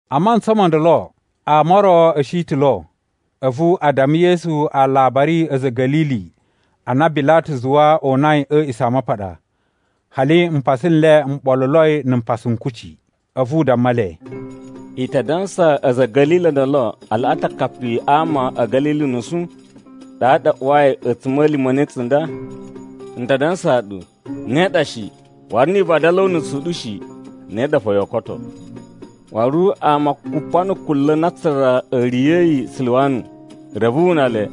A mantsa mo ndolo ama o ro a̱ shi ta̱ lo, a̱vu a damma Yesu alabari a̱ a̱za̱ a̱ Ga̱lili a na Bilatu zuwa o unai a̱ A̱a̱ꞌisamapaɗa, hali mpasa n le m ɓoluloi na̱ mpasa n kucci. A̱vu u damma le, “I ta dansa a̱za̱ a̱ Ga̱lili o ndolo a laꞌa ta̱ akapi a ama a̱ Ga̱lili unusu, ɗaɗa a uwai a̱tsuma̱lima̱ ne tsunda? N ta dansaa ɗu, ne ɗa shi! Waru ni i vadala o unusu u ɗu shi, ne ɗa fo yoo koto. Waru ama kupa na̱ kunla̱ na aatsura a̱ riya̱yi a Siluwamu, reve wu una le,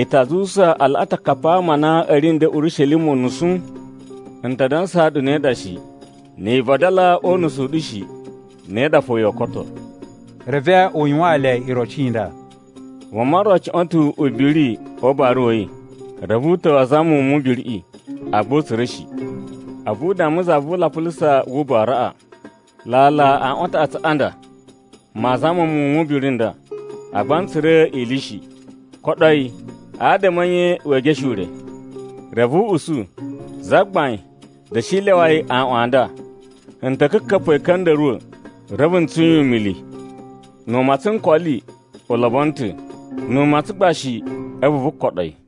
i ta zuwusa a laꞌa ta̱ akapi a ama a na a̱ ri nden Urishelima unusu? N ta dansaa ɗu ne ɗa shi. Ni i vadala o unusu u ɗu shi, ne ɗa fo yoo koto.” Reve u yuwaan le iroci i nda: “Vuma ro cuꞌwa̱n ta̱ ubiri o ubara wa̱ yi. Reve u ta̱wa̱ a zama muwun mu ubiriꞌi agba u tsura̱ shi. A̱vu u damma za vu ulapulusa wu ubaraꞌa, ‘Lala aꞌwan a taꞌatsu a ɗa nda maa zama muwun o ubiri u nda, agba n tsura̱ ili shi. Koɗo yi, adama a̱ nye wee geshe ure?’ “Reve u usu, ‘Zagbain, da̱shi lyawa yi a aaꞌwan a nda. N ta̱ ka̱ka̱pa̱ yi a̱ ka̱nda̱ruwa̱, reve n tsun yi umili. Nu u matsan nkoli, u lobono ta̱. Nu u matsan gba shi, a̱vu vu koɗo yi.’”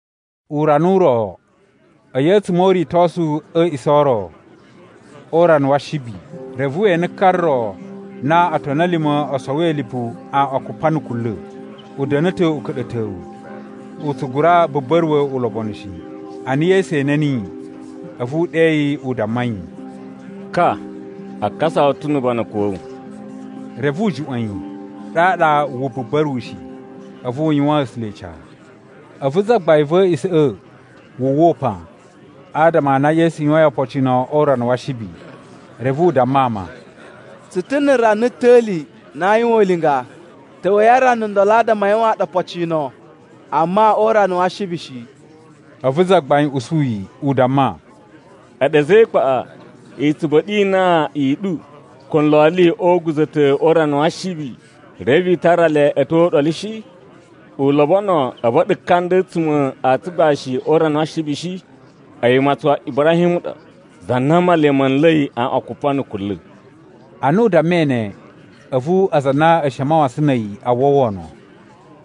Urana u ro, a̱yi a̱tsuma̱ o uritosu a̱ a̱a̱ꞌisa̱ o ro, o urana wa Ashibi, reve we ene ka ro na otoni a̱ lima̱ o sowoi lipu aꞌwan kupa na̱ kunla̱. U da̱na̱ ta̱ uka̱ɗa̱towu, u tsu gura buba̱ruwa̱ ulobonu shi. Ana Yesu ene niyi, a̱vu u ɗe yi u damma yi, “Ka, a kasa wu ta̱ nu ubanakun wa̱ wu.” Reve u juꞌwa̱n yi, ɗaɗa wu buba̱ruwushi, a̱vu u yuwaan A̱sula̱ ica. A̱vu zagbain va̱ a̱a̱ꞌisa̱ꞌa̱ wu uwwa upan, adama a na Yesu yuwain opocino o urana wa Ashibi. Reve u damma ama, “Tsu ta̱ na̱ rana ta̱li na aa yuwan ulinga. Ta̱wa̱i a rana ndolo adama a yuwaan ɗu opocino, amma o urana wa Ashibi shi.” A̱vu Zagbain usu yi, u damma, “A̱ɗu a̱za̱ e ikpaꞌa! I tsu ba̱ɗa̱ inan i ɗu ko nloli o uguza̱ta̱ o urana wa Ashibi, reve i tara le a̱ tyo o uɗolu shi? U lobono a̱ ba̱ɗa̱ ka nda a̱tsuma̱ a tsugbashi o urana wa Ashibi shi? A̱yi umatsun wa Ibrahim u ɗa, za na Male ma̱ nla̱i aꞌwan kupa na̱ kunla̱.” Ana u dammai ne, a̱vu aza a na a̱ shi a mawasan na̱ a̱yi a uwwa wono.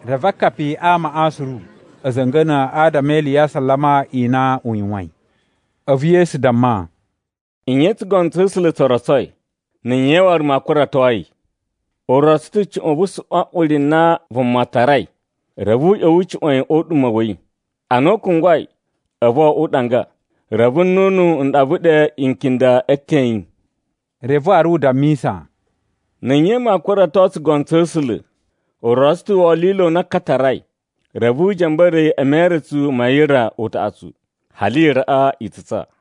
Reve akapi a amaꞌa suru a̱ za̱nga̱na̱ adama e ili ya asalama i na u yuwain. A̱vu Yesu damma, “Nye tsugono tsa̱ A̱sula̱ tso rotsoi, na̱ nye waru maa kurato yi? U rotso ta̱ cuꞌun vu suꞌwan uri na vuma tarai, reve u ꞌya̱wa̱ u cuꞌwa̱n yi o uɗuma̱ wa̱ yi. Ana u kungwai, a̱vu wo oꞌwo uɗanga, reve nnunu n ɗava ɗe ikinda e eten a̱ yi.” Reve waru u dammisa, “Na̱ nye maa kurato tsugono tsa̱ A̱sula̱? U rotso ta̱ wolilo u na ka tarai, reve u ja̱mba̱ra̱ yi e meretsu ma yira utaꞌatsu hali yiraꞌa i tsutsa.”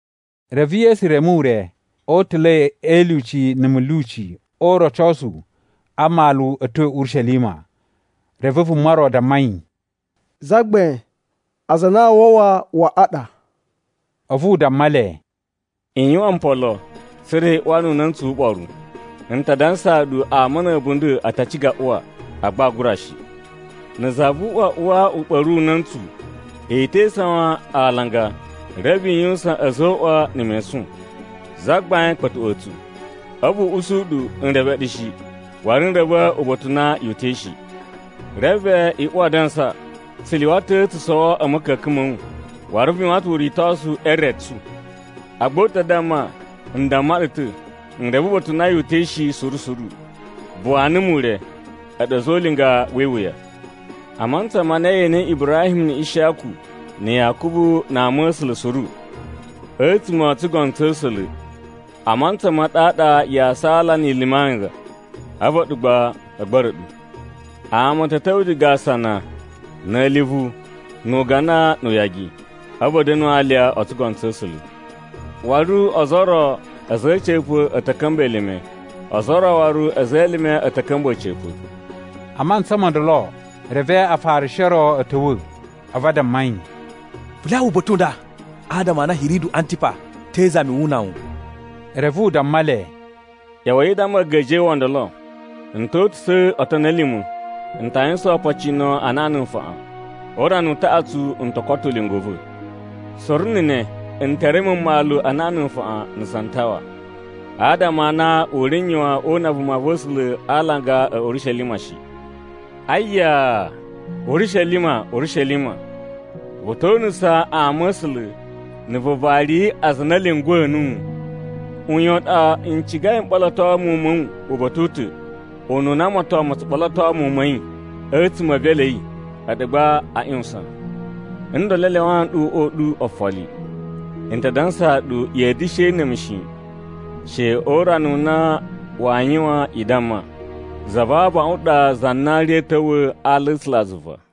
Reve Yesu reme ure o utula̱i e ilyuci na̱ mulyuci o urocosu a mmalu a̱ tyo Urishelima. Reve vuma ro damma yi, “Zagbain, aza a na aa wawa waꞌa ɗa?” A̱vu u damma le, “I yuwan mpolo tsa̱ra̱ i uwa nu una̱ntsu wu uɓoru. N ta dansaa ɗu ama na̱ a̱bunda̱ a ta ciga a uwa, agba aa gura shi. Na̱ za vu uꞌwa uwa u ɓa̱ru una̱ntsu, i te isawan a alanga reve i yuwusan a̱zoꞌwa na̱ mesun, ‘Zagbain, kpa̱tuꞌwa̱a̱ tsu.’ “A̱vu u usu ɗu, ‘N reve ɗu shi, waru n reve uba̱ta̱ u na yu uta̱i shi.’ “Reve i uwa adansa, ‘Tsu lyuwa ta̱ tsu sowo a̱ ma̱ka̱ka̱n ma̱ wu. Waru vu yuwan ta̱ uritosu e re tsu.’ “Agba u ta damma, ‘N damma ɗu ta̱, n reve uba̱ta̱ u na yu uta̱i shi suru suru. Buwa numu ure, a̱ɗu a̱za̱ o ulinga wi iwuya.’ “A mantsa ma na ye enei Ibrahim na̱ Ishiyaku na̱ Yakubu na ama̱sula̱ suru, a̱tsuma̱ o tsugono tsa̱ A̱sula̱, a mantsa ma ɗaɗa yaa saala ni i lumi anga, a̱vu a̱ɗu gba a̱ gba̱ra̱ ɗu. Ama a̱ ta̱ ta̱wa̱ diga asana na̱ a̱livu nu ugana nu uyagi. A̱vu a̱ da̱nu alya o tsugono tsa̱ A̱sula̱. Waru ozo o ro a̱za̱ a̱ a̱ca̱pa̱ a̱ ta̱ ka̱mba̱ elime, ozo o ro waru a̱za̱ e elime a̱ ta̱ ka̱mba̱ a̱ca̱pa̱.” A mantsa mo ndolo, reve Afarishi o ro a̱ ta̱wa̱, a̱vu a damma yi, “Vu lyawa uba̱ta̱ u nda, adama a na Hiridu Antiba te izami wu una wu.” Reve u damma le, “ꞌYa̱wa̱i i damma a̱a̱ga̱ja̱wa̱ o ndolo, ‘N ta̱ uta̱su otoni a̱ lima̱, n ta yuwusan opocino anaꞌan na̱ nfaꞌan. O urana u taꞌatsu n to koto ulinga u va̱. Suru na̱ ne, n te reme mmalu anaꞌan na̱ nfaꞌan na̱ santawa. Adama a na u ri n yuwan o una vumava̱sula̱ a alanga a̱ Urishelima shi.’ “Ayaa! Urishelima, Urishelima, vu to unusa ama̱sula̱ na̱ vu vari aza a na a̱ lyunguwa̱ nuwu! Uyan u ɗa n cigai m ɓoloto muwun ma̱ wu uba̱ta̱ u ta̱ ununa moton ma̱ tsu ɓoloto muwun ma̱ yi a̱tsuma̱ e evelu a̱ yi, a̱ɗu gba a ꞌyuwusan! Ndolo a lyawaa nɗu uꞌwa u ɗu ofoli. N ta dansaa ɗu ya̱a̱ da̱shi ene mu shi, she o urana u na waa yuwan i damma, ‘Za va abaꞌun ɗa za na ri a̱a̱ ta̱wa̱ a ala a̱ A̱sulazuva.’”